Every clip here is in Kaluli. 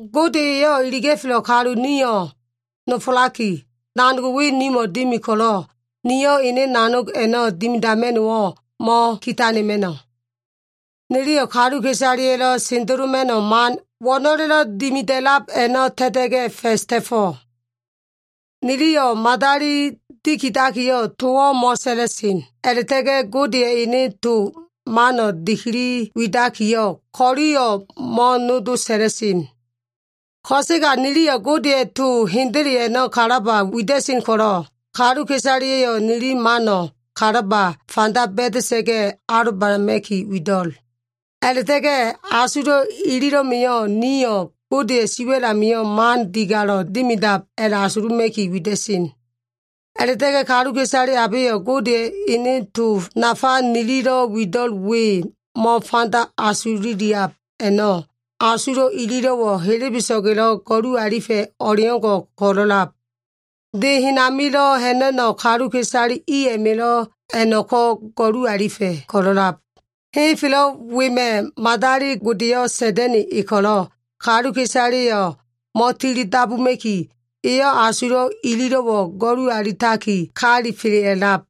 Gode eyo꞉ iliga꞉felo꞉ kalu nio꞉ nofolaki, nanog we nimo꞉ dimi ko꞉lo꞉, nio꞉ ene nanog a꞉no꞉ dimidama꞉no꞉wo꞉ mo꞉kitanema꞉no꞉. Niliyo꞉ kaluka꞉isaleya꞉lo꞉ sendeloma꞉no꞉ man wo꞉no꞉lelo꞉ dimida꞉lab a꞉no꞉ ta꞉ta꞉ga꞉ fa꞉s ta꞉fo꞉. Niliyo꞉ madali dikidakiyo꞉ towo꞉ mo꞉sa꞉la꞉sen, a꞉la꞉ta꞉ga꞉ Godeya꞉ ene to mano꞉ dikili widakiyo꞉, ko꞉liyo꞉ mo꞉nodo sa꞉la꞉sen. Ko꞉sega niliyo꞉ Godeya꞉ to hendele a꞉no꞉ kalaba wida꞉sen ko꞉lo꞉, kaluka꞉isaleya꞉yo꞉ nili mano꞉ kalaba fanda ba꞉da꞉sa꞉ga꞉ alobanama꞉ki wido꞉l. A꞉la꞉ta꞉ga꞉ asulo꞉ ililo꞉ma꞉yo꞉ niliyo꞉ Godeya꞉ siwa꞉l amio꞉ man digalo꞉ dimidab a꞉la꞉asuluma꞉ki wida꞉sen. A꞉la꞉ta꞉ga꞉ kaluka꞉isale abeyo꞉ Godeya꞉ ene to nafa nililo꞉ wido꞉l we mo꞉fanda asululiab a꞉no꞉, asulo꞉ ililo꞉wo꞉ helebeso꞉ga꞉lo꞉ go꞉lu alifa꞉ o꞉leo꞉ngo꞉ ko꞉lo꞉lab. De hen amilo꞉ ha꞉na꞉no꞉ kaluka꞉isale i a꞉ma꞉lo꞉ a꞉no꞉ko꞉ go꞉lu alifa꞉ ko꞉lo꞉lab. Henfelo꞉ wema꞉ madali godeyo꞉ Sa꞉da꞉na꞉ e ko꞉lo꞉, kaluka꞉isaleyo꞉ mo꞉tili dabuma꞉ki, eyo꞉ asulo꞉ ililo꞉wo꞉ go꞉lu alitaki kalifela꞉lab.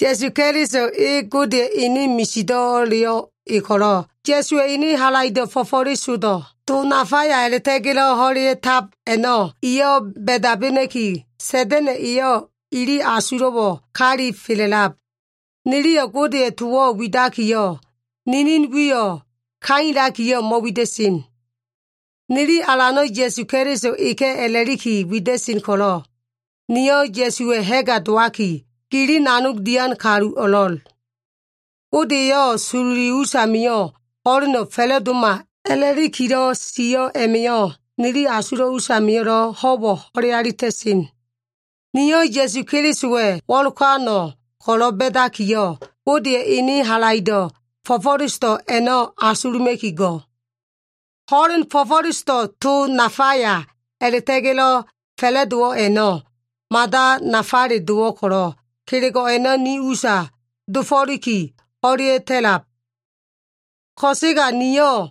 Ya꞉su Keliso e Godeya꞉ ene misido꞉leyo꞉ e ko꞉lo꞉, Ya꞉suwa꞉ ene halaido꞉ fo꞉fo꞉lesodo꞉, to nafaya a꞉la꞉ta꞉ga꞉lo꞉ ho꞉lea꞉tab a꞉no꞉, iyo꞉ ba꞉dabena꞉ki, Sa꞉da꞉na꞉ eyo꞉ ili asulo꞉wo꞉ kalifela꞉lab. Niliyo꞉ Godeya꞉ towo꞉ widakiyo꞉, ninin wiyo꞉ kailakiyo꞉ mo꞉wida꞉sen. Nili Alano꞉ Ya꞉su Keliso eka꞉ a꞉la꞉liki wida꞉sen ko꞉lo꞉, nio꞉ Ya꞉suwa꞉ ha꞉ga dowaki, gili nanog dian kalu o꞉lo꞉l. Gode eyo꞉ sololi usamio꞉ ho꞉leno꞉ fa꞉la꞉doma a꞉la꞉likilo꞉ sio꞉ a꞉ma꞉yo꞉, nili asulo꞉ usamio꞉lo꞉ ho꞉wo꞉ ho꞉le alita꞉sen. Nio꞉ Ya꞉su Kelisowa꞉ wo꞉lokano꞉ ko꞉lo꞉ ba꞉dakiyo꞉, Godeya꞉ ene halaido꞉ fo꞉fo꞉lesodo꞉ a꞉no꞉ asuluma꞉ki go꞉. Ho꞉len fo꞉fo꞉lesodo꞉ to nafaya a꞉la꞉ta꞉ga꞉lo꞉ fa꞉la꞉dowo꞉ a꞉no꞉, mada nafale dowo꞉ ko꞉lo꞉, kelego꞉ a꞉no꞉ ni usa dofo꞉liki ho꞉lea꞉ta꞉lab. Ko꞉sega nio꞉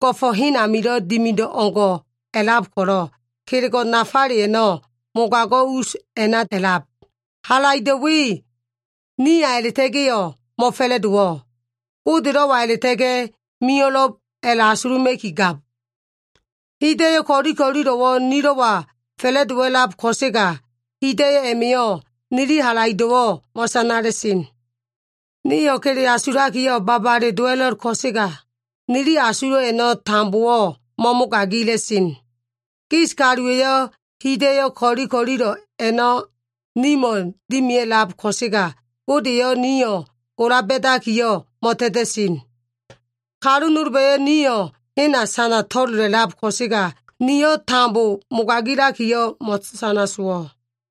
go꞉fo꞉ hen amilo꞉ dimido꞉ o꞉ngo꞉ a꞉lab ko꞉lo꞉, kelego꞉ nafale a꞉no꞉ mogago꞉ us a꞉na a꞉lab. Halaido꞉ we niya a꞉la꞉ta꞉ga꞉yo꞉ mo꞉fa꞉la꞉dowo꞉. Godelo꞉wa a꞉la꞉ta꞉ga꞉ mio꞉lo꞉b a꞉la꞉asuluma꞉ki gab. Hida꞉yo꞉ ko꞉li ko꞉lilo꞉wo꞉ nilo꞉wa fa꞉la꞉dowa꞉lab ko꞉sega, hida꞉yo꞉ a꞉ma꞉yo꞉ nili halaido꞉wo꞉ mo꞉sanala꞉sen. Nio꞉ kele asulakiyo꞉ babale dowa꞉lo꞉l ko꞉sega, nili asulo꞉ a꞉no꞉ tambowo꞉ mo꞉mogagila꞉sen. Gis kaluwa꞉yo꞉ hida꞉yo꞉ ko꞉li ko꞉lilo꞉ a꞉no꞉ nimo꞉ dimia꞉lab ko꞉sega, Gode eyo꞉ nio꞉ gola ba꞉dakiyo꞉ mo꞉ta꞉ta꞉sen. Kalu nolba꞉yo꞉ nio꞉ hena sana to꞉lola꞉lab ko꞉sega, niyo꞉ tambo mogagilakiyo꞉ mo꞉sana sowo꞉.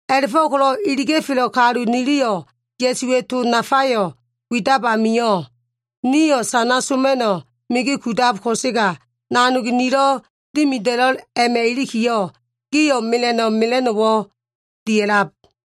A꞉la꞉fo꞉ko꞉lo꞉ iliga꞉felo꞉ kalu niliyo꞉ Ya꞉suwa꞉ to nafayo꞉ widab amio꞉, nio꞉ sana soma꞉no꞉ migi kudab ko꞉sega, nanog nililo꞉ dimida꞉lo꞉l a꞉ma꞉ ilikiyo꞉, gio꞉ mela꞉no꞉ mela꞉no꞉wo꞉ dia꞉lab.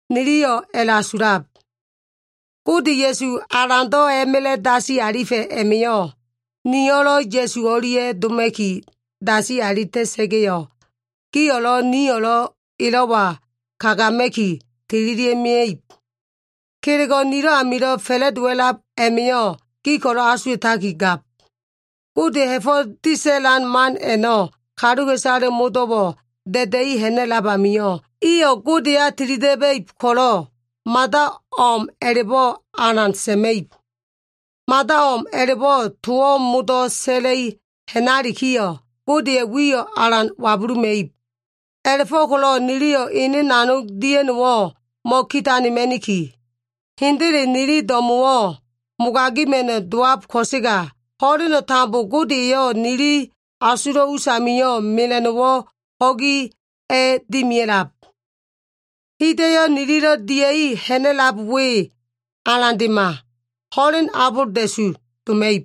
Niliyo꞉ a꞉la꞉asulab. Gode Ya꞉su Alando꞉ a꞉ma꞉la꞉ dasi alifa꞉ a꞉ma꞉yo꞉, nio꞉lo꞉ Ya꞉su o꞉lia꞉ doma꞉ki dasi alita꞉sa꞉ga꞉yo꞉, gio꞉lo꞉ nio꞉lo꞉ elo꞉wa kagama꞉ki tililia꞉ mia꞉ib. Kelego꞉ nilo꞉ amilo꞉ fa꞉la꞉dowa꞉lab a꞉ma꞉yo꞉ gi ko꞉lo꞉ asuwa꞉takigab. Godeya꞉ ha꞉fo꞉ disa꞉lan man a꞉no꞉ kaluka꞉isale modo꞉ amio꞉ golalikiyo꞉, iyo꞉ Godeya tilida꞉ba꞉ib ko꞉lo꞉, mada o꞉m a꞉la꞉bo꞉ alan sa꞉ma꞉ib. Mada o꞉m a꞉la꞉bo꞉ towo꞉ modo꞉ sa꞉la꞉i ha꞉nalikiyo꞉, Godeya꞉ wiyo꞉ alan wabuluma꞉ib. A꞉la꞉fo꞉ko꞉lo꞉ niliyo꞉ ene nanog dia꞉no꞉wo꞉ mo꞉kitanema꞉niki. Hendele nili do꞉mo꞉wo꞉ mogaima꞉no꞉ dowab ko꞉sega, ho꞉leno꞉ tambo Gode eyo꞉ nili asulo꞉ us amio꞉ mela꞉no꞉wo꞉ ho꞉gi a꞉dimia꞉lab. Hida꞉yo꞉ nililo꞉ dia꞉i ha꞉na꞉lab we alandema, ho꞉len abolda꞉su doma꞉ib.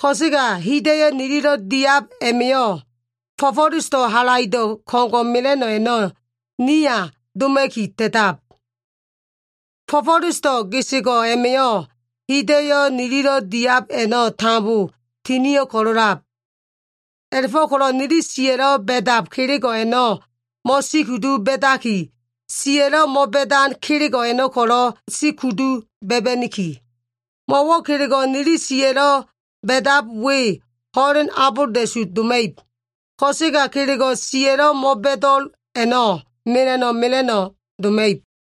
Ko꞉sega hida꞉yo꞉ nililo꞉ diab a꞉ma꞉yo꞉, fo꞉fo꞉lesodo꞉ halaido꞉ ko꞉ngo꞉ mela꞉no꞉ a꞉no꞉ niya doma꞉ki ta꞉tab. Fo꞉fo꞉lesodo꞉ gesego꞉ a꞉ma꞉yo꞉ hida꞉yo꞉ nililo꞉ diab a꞉no꞉ tambo tinio꞉ ko꞉lo꞉lab. A꞉la꞉fo꞉ko꞉lo꞉ nili siya꞉lo꞉ ba꞉dab kelego꞉ a꞉no꞉ mo꞉sikudu ba꞉daki, siya꞉lo꞉ mo꞉ba꞉dan kelego꞉ a꞉no꞉ ko꞉lo꞉ sikudu ba꞉ba꞉niki. Mo꞉wo꞉ kelego꞉ nili siya꞉lo꞉ ba꞉dab we ho꞉len abolda꞉su doma꞉ib. Ko꞉sega kelego꞉ siya꞉lo꞉ mo꞉bo꞉do꞉l a꞉no꞉ mela꞉no꞉ mela꞉no꞉ doma꞉ib.